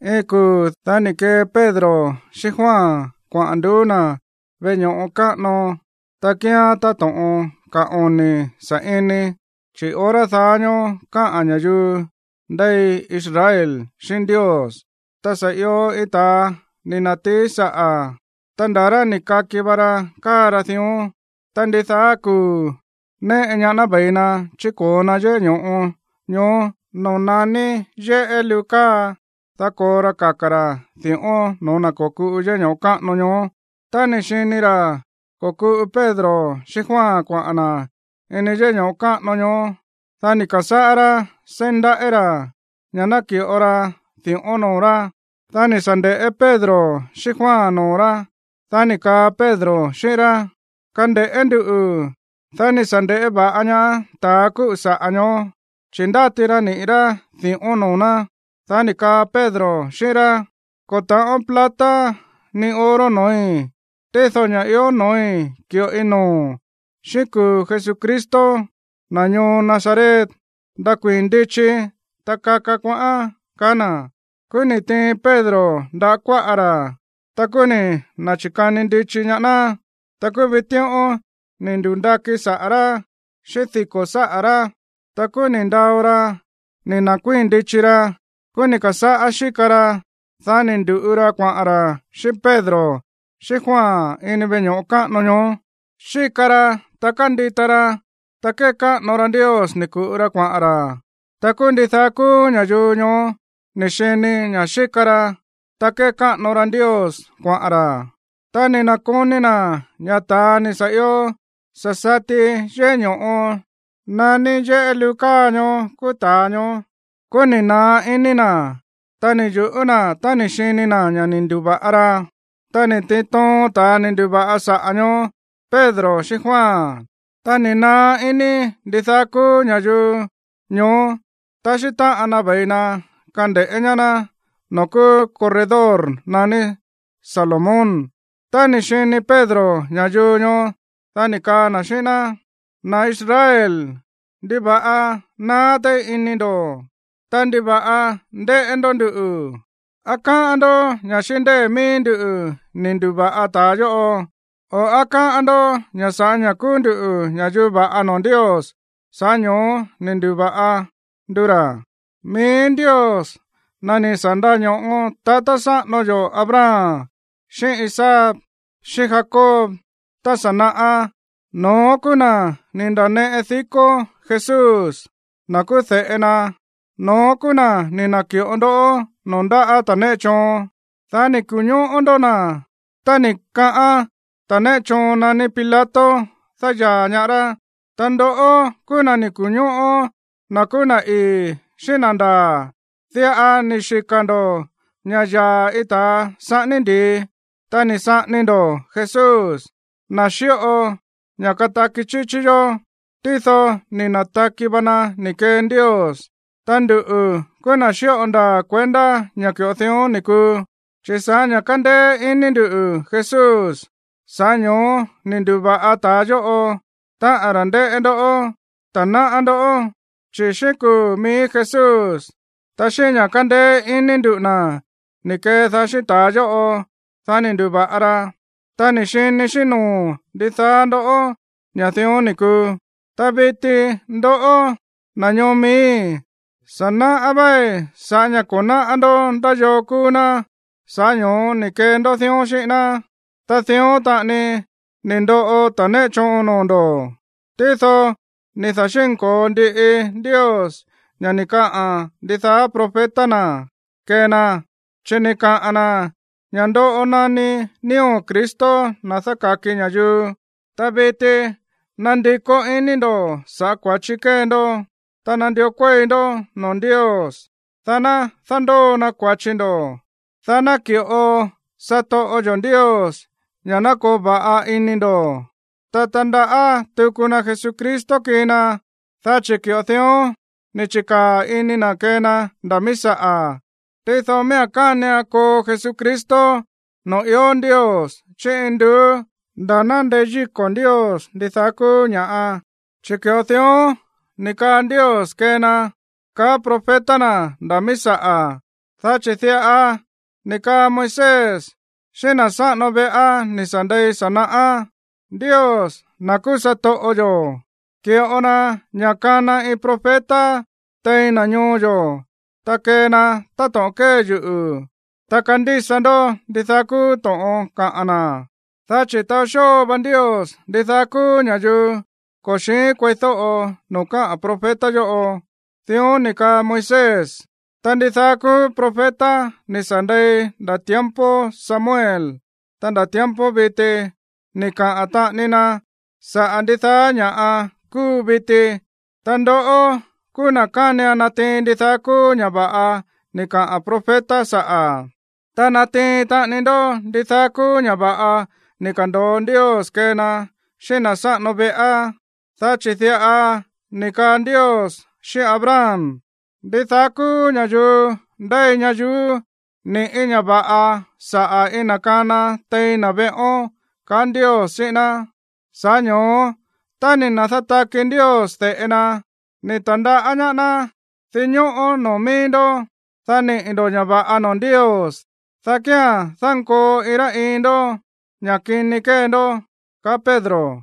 Iin kuu̱, dá ni̱ kee Pedro xíꞌín Juan kuaꞌa̱n nduú na̱ veꞌe ño̱ꞌo káꞌano, ta kíán táto̱ꞌon ka̱ oni̱ sa̱ꞌini, chi̱ hora daá ñóó káꞌa̱n ña̱yuu ndéi Israel xíꞌín Ndios. Ta sa̱ io iin ta̱a ni̱ na̱tií saꞌa̱, ta nda̱ rá ni̱ kaki va ra káa ra dión. Ta ndidaá kuu̱ néꞌe ñaá ná ve̱i na chíko̱o na yéꞌé ño̱ꞌo ñoó no̱ó naní yéꞌé luu káa, dá ko̱o ra kaka̱ ra̱ di̱ꞌón no̱ó na̱ ko̱kuꞌu yéꞌé ño̱ꞌo káꞌano ñoó. Tá ni̱ xini ra̱ ko̱kuꞌu Pedro xíꞌín Juan kuaꞌa̱n na̱ ini yéꞌé ño̱ꞌo káꞌano ñoó, dá ni̱ ka̱sáꞌá rá seí ndaꞌí ra̱ ña̱ ná ki̱ꞌo na di̱ꞌón noo̱ rá. Dá ni̱ sa̱ nde̱ꞌé Pedro xíꞌín Juan noo̱ rá. Dá ni̱ kaa Pedro xíꞌín rá: ―Kande̱ꞌé nduꞌu̱. Dá ni̱ sa̱ nde̱ꞌé va̱ꞌa ñaá ta̱ kúꞌu̱ saꞌa̱ ñoó, chi̱ ndáti ra niꞌi̱ rá di̱ꞌón noo̱ ná. Dá ni̱ kaa Pedro xíꞌín rá: ―Ko̱ ta̱ꞌón plata ni oro no̱ói̱. Tído ña̱ ió no̱ói̱, ki̱ꞌoi noo̱o̱n. Xíꞌín kuu̱ Jesucristo, na̱ ñoo Nazaret, ndakuii̱n ndichi, ta kaka kuaꞌán ―kaá na̱. Kúú ni̱ tiin Pedro ndáꞌa̱ kuáꞌa ra̱. Ta kúú ni̱ na̱chi̱kani ndichi ñaá ná. Ta kúú vitíꞌón ni̱ ndu̱ndakí saꞌa̱ rá xíꞌín diko̱ sáꞌa̱ rá. Ta kúú ni̱ ndao ra ni̱ na̱kuii̱n ndichi ra. Kúú ni̱ ka̱sáꞌá xíka ra. Dá ni̱ ndu̱ꞌu ra kuaꞌa̱n ra̱ xíꞌín Pedro xíꞌín Juan ini veꞌe ño̱ꞌo káꞌano ñoó. Xíka ra, ta kándita ra, ta kékáꞌano ra Ndios ni̱ ku̱ꞌu ra kuaꞌa̱n ra̱. Ta kúú ndidaá kúú ña̱yuu ñoó ni̱ xini ña̱ xíka ra, ta kékáꞌano ra Ndios kuaꞌa̱n ra̱. Ta ni̱ na̱koni na̱ ña̱ ta̱a ni̱ sa̱ io sa̱ sati yéꞌé ño̱ꞌo naní yéꞌé luu káa ñoó kúú ta̱a ñoó. Kúú ni̱ naá ini na̱, ta ni̱ yu̱ꞌú na̱ tá ni̱ xini na̱ ña̱ ni̱ ndu̱va̱ꞌa ra. Ta ni̱ tiin toon ta̱ ni̱ ndu̱va̱ꞌa saꞌa̱ ñoó Pedro xíꞌín Juan. Ta ni̱ naá iní ndidaá kúú ña̱yuu ñoó taxí táꞌan na ve̱i na kande̱ꞌé ñaá ná noo̱ kúú corredor naní Salomón. Tá ni̱ xini Pedro ña̱yuu ñoó, dá ni̱ kaa na̱ xíꞌín ná: ―Na̱ Israel, ¿ndiva̱ꞌa naá téí iní ndo̱? Ta, ¿ndiva̱ꞌa ndéꞌé ndó nduꞌu̱? ¿Á káꞌán ndó ña̱ xíꞌín ndée̱ mií nduꞌu̱ ni̱ ndu̱va̱ꞌa ta̱a yóꞌo? O, ¿á káꞌán ndó ña̱ sa̱ꞌá ña̱ kúú ndú ña̱yuu va̱ꞌa noo̱ Ndios, sa̱ꞌá ño̱ó ni̱ ndu̱va̱ꞌa ndu ra̱? Mií Ndios, na̱ ni̱ sa̱ ndaño̱ꞌo tatá sáꞌano yo̱ Abraham xíꞌín Isaac xíꞌín Jacob tá sa̱ naꞌá, no̱ón kúú na̱ ni̱ nda̱neꞌe dikó Jesús, na̱ kúú de̱ꞌe na. No̱ón kúú na̱ ni̱ na̱ki̱ꞌo ndó noo̱ ndáꞌa̱ ta̱ néꞌe choon. Dá ni̱ ku̱ñóꞌó ndó na̱ tá ni̱ kaꞌán ta̱ néꞌe choon naní Pilato dáyaa̱ ñaá rá. Ta ndoꞌó kúú na̱ ni̱ ku̱ñóꞌó na̱ kúú na̱ ii̱ xíꞌín na̱ ndaa̱. Diꞌa ni̱ xika̱ ndo̱ ña̱ yaa̱ iin ta̱a saꞌání ndi̱i. Ta ni̱ saꞌání ndo̱ Jesús, na̱ xíꞌo ña̱ kataki chíchí yó. Tído ni̱ na̱taki va na̱ ni̱ kee Ndios. Ta nduꞌu̱ kúú na̱ xíꞌo ndaa̱ kuendá ña̱ ki̱ꞌo dión ni̱ kuu. Chi̱ sa̱ꞌá ña̱ kándéé iní ndu̱ Jesús, sa̱ꞌá ño̱ó ni̱ ndu̱va̱ꞌa ta̱a yóꞌo, táꞌa̱n ra̱ ndéꞌé ndó, ta náꞌá ndó. Chi̱ xíꞌín kuu̱ mií Jesús, ta xíꞌín ña̱ kándéé iní nduꞌu̱ na̱ ni̱ kedaá xíꞌín ta̱a yóꞌo, dá ni̱ ndu̱va̱ꞌa ra, ta ni̱ xini xíꞌín noo̱ ndidaá ndó ña̱ dión ni̱ kuu. ’Ta viti ndoꞌó, na̱ ñoo miíi̱, sa̱ náꞌá véí ña̱ sa̱ꞌá ña̱ ko̱ náꞌá ndó ndá yoo kúú ná, sa̱ꞌá ño̱ó ni̱ kee ndó dión xíꞌín ná. Ta dión taꞌani ni̱ ndoꞌo ta̱ néꞌe choon noo̱ ndo̱. Tído ni̱ da̱xi̱nko̱o ndiꞌi Ndios ña̱ ni̱ kaꞌa̱n ndidaá profeta na̱ kee na. Chi̱ ni̱ kaꞌa̱n na̱ ña̱ ndoꞌo naní nío̱ Cristo, na̱ dáka̱ki ña̱yuu. Ta viti nandikó iní ndo̱ saꞌa̱ kua̱chi kée ndó. Ta nandió kuéi ndó noo̱ Ndios, dá ná dándóo na kua̱chi ndo̱, dá ná ki̱ꞌo satoꞌo yo̱ Ndios ña̱ ná koo va̱ꞌa ini ndo̱. Ta tandaꞌá tuku na Jesucristo kii na, dá chi̱ ki̱ꞌo dión ni̱ chi̱kaa̱ ini na̱ kee na nda̱ mií saꞌa̱. ’Tído miía̱n kánian koo Jesucristo noo̱ ió Ndios chí induú nda̱ ná ndeyíko̱ Ndios ndidaá kúú ña̱ꞌa, chi̱ ki̱ꞌo dión ni̱ kaa Ndios kee na, kaá profeta na̱ nda̱ mií saꞌa̱. Dá chi̱ diꞌa ni̱ kaa Moisés xíꞌín na̱ sáꞌano veꞌá ni̱ sa̱ ndei sa̱ naꞌá: “Ndios, na̱ kúú satoꞌo yo̱, ki̱ꞌo na ña̱ kana iin profeta tein na̱ ñoo yo̱, ta kee na táto̱ꞌon kée yuꞌu̱. Ta kandísa ndó ndidaá kúú to̱ꞌon kaꞌa̱n na̱. Dá chi̱ taó xóo va Ndios ndidaá kúú ña̱yuu ko̱ xi̱ín kueídóꞌo noo̱ kaꞌa̱n profeta yóꞌo.” Dión ni̱ kaa Moisés. ’Ta ndidaá kúú profeta ni̱ sa̱ ndei nda̱ tiempo Samuel, ta nda̱ tiempo viti ni̱ kaꞌa̱n taꞌani na saꞌa̱ ndidaá ña̱ꞌa kúu viti. Ta ndoꞌó kúú na̱ kánian natiin ndidaá kúú ña̱ va̱ꞌa ni̱ kaꞌa̱n profeta saꞌa̱, ta natiin taꞌani ndó ndidaá kúú ña̱ va̱ꞌa ni̱ ka̱ndo̱o Ndios kee na xíꞌín na̱ sáꞌano veꞌá. Dá chi̱ diꞌa ni̱ kaa Ndios xíꞌín Abraham: “Ndidaá kúú ña̱yuu ndéi ñayuú ni̱ꞌí ña̱ va̱ꞌa saꞌa̱ iin na̱ kana tein na̱ veꞌón”, kaá Ndios xíꞌín ná. Sa̱ꞌá ño̱ó tá ni̱ da̱nátaki Ndios de̱ꞌe na, ni̱ ta̱ndaꞌá ñaá ná dinñóꞌó noo̱ mií ndó, dá niꞌi̱ ndo̱ ña̱ va̱ꞌa noo̱ Ndios, dá kía̱n dankoo iin rá iin ndó ña̱ kini kée ndó ―kaa Pedro.